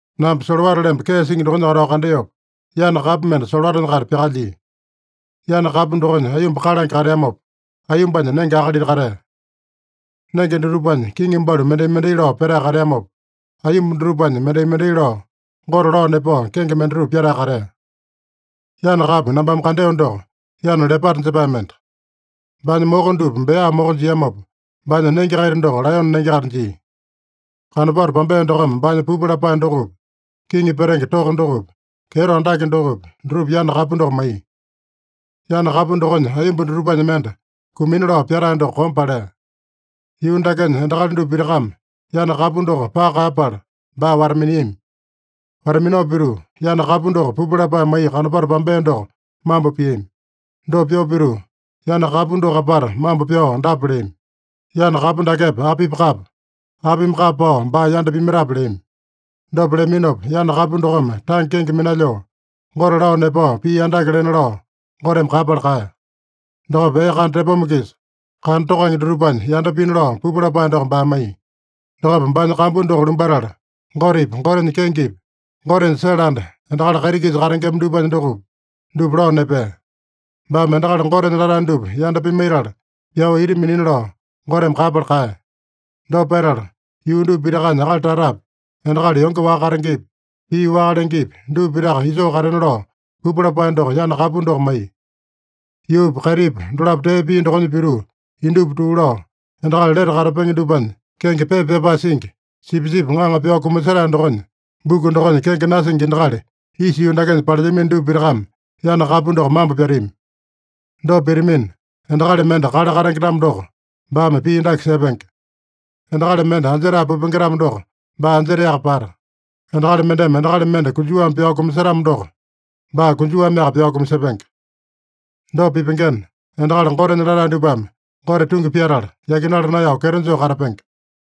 Namba solowata lemba kee singi dokonya katao kandeopa, yana kapu mende solowatanya-kaita pyakalyia. Yana kapu dokonya aiyomba kalange kateamopa, aiyombanya nenge akalita katea. Nenge dutupanya kiŋi balu mendai-mendai lao petae kateamopa, aiyomba dutupanya mendai-mendai lao Gote lao nepao kenge mendatupa pyatae katea. Yana kapu nambame kandeo doko yana lepata jepae mende. Baanya moko dupa bea moko jiamopa, baanya nenge-kaita doko laeyone nenge-kaita jia. Kanopato pambea dokome baanya pupu lapae dokopi, kiŋi petenge toko dokopi, kyeto andake dokopi, dutupa yana kapu doko maiya. Yana kapu dokonya aiyomba dutupanya mende kumina lao pyatae doko kombe palea. Yuu dakenya endakali dupa pitakame yana kapu doko paka kaeyapala baa wata-miniami. Wata-minao pituu, yana kapu doko pupu lapae maiya kanopato pambea doko mambo piami. Dopa pyoo pituu, yana kapu doko apata mambo pyao dapa leami: “Yana kapu dakepa apipa kapa? Apimi kapa pao baa yanda pimaitape?” leami. Dopa leaminopa yana kapu dokome tange kenge minalyoo, Gote lao nepao pii andake lena lao Goteme kaeyapala kaeya. Dokopa ee kana tepoma-kisa kana tokange dutupanya yanda pina lao pupu lapae doko baa maiya. Dokopa baanya kambu doko lumbatala, Gotepi, Gotenya kengepi, Gotenya sele anda, endakali kaiti-kisa katengema dupanya dokopi, dupa lao nepea. Baame endakali Gotenya latae dupa yanda pimaitala pyao ita minina lao Goteme kaeyapala kaeya. Dopa petala, yuu dupa pitakanya akali tatapi, endakali yonge waka katengepi, pii waka lengepi, dupa pitaka isoo katena lao pupu lapae doko yana kapu doko maiya. Yuupa kaitipa dolapo tee pia dokonya pituu, indupa tuu lao, endakali lete katapenge dupanya kenge pepa pyapae singi, Sipisipi Ŋaŋa pyao kumasetae dokonya buku dokonya kenge nasingi endakali isa yuu dakenya palelyamino dupa pitakame yana kapu doko mambo pyatami. Dopa pitamina, endakali mende kale katenge-tamo doko, baame pii dake sepenge: Endakali mende anjetae pupenge-tamo doko, baa anjetaeyaka pata. Endakali mendeme endakali mende konjuwame pyao kumasetamo doko, baa konjuwameaka pyao kumasepenge. Dopa pipengena, endakali Gotenya latae dupame Gote tungi pyatala, yakinala naeyao kyeto joo katapenge.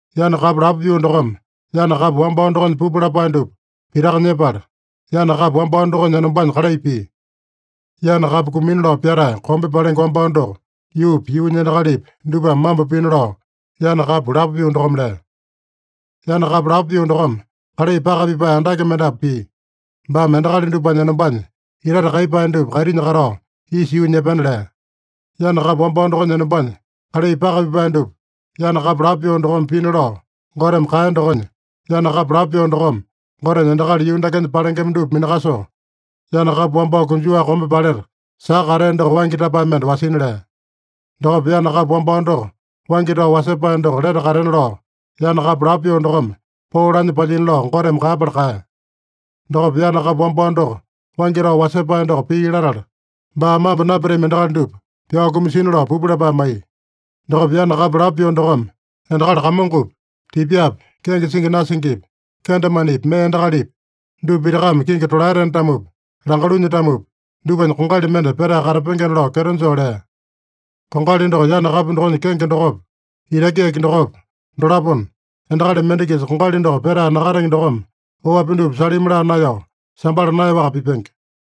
Yana kapu lapo pyoo dokome yana kapu wambao dokonya pupu lapae dupa pitaka nyepala, yana kapu wambao dokonya enombanya kalai pia. Yana kapu kumina lao pyatae kombe palenge wambao doko yuupi, yuunya endakalipi, dupame mambo pina lao yana kapu lapo pyoo dokome lea. Yana kapu lapo pyoo dokome kalai paka pipae andake mendapu pia. Baame endakali dupanya enombanya itate kaiyepae dupa kaitinya katao isa yuunya epena lea. Yana kapu wambao dokonya enombanya kalai paka pipae dupa yana kapu lapo pyoo dokome pina lao Goteme kaeya dokonya, yana kapu lapo pyoo dokome Gotenya endakali yuu dakenya palengema dupa minakasoo, yana kapu wambao konjuwa kombe paleta saka katea doko waingi tapae mende wasina lea. Dokopa yana kapu wambao doko waingi tao wasepae doko lete katena lao, yana kapu lapo pyoo dokome poo lanya palyina lao Goteme kaeyapala kaeya. Dokopa yana kapu wambao doko waingi tao wasepae doko pii latala, baa mambo napyatami endakali dupa pyao kumasina lao pupu lapae maiya. Dokopa yana kapu lapo pyoo dokome endakali kamongopi, tipyapi, kenge singi nasingipi, kendemanepi, mee endakalipi, dupa pitakame kingi tolaetena-tamopi, langalunya-tamopi, dupanya kongali mende petae katapengena lao kyeto joo lea. Kongali doko yana kapu dokonya kenge dokopa, itaki yaki dokopa, dolapona, endakali mende-kisa kongali doko petae nakatenge dokome oapi dupa salimi laa naeyao, sambala naeyaowaka pipenge.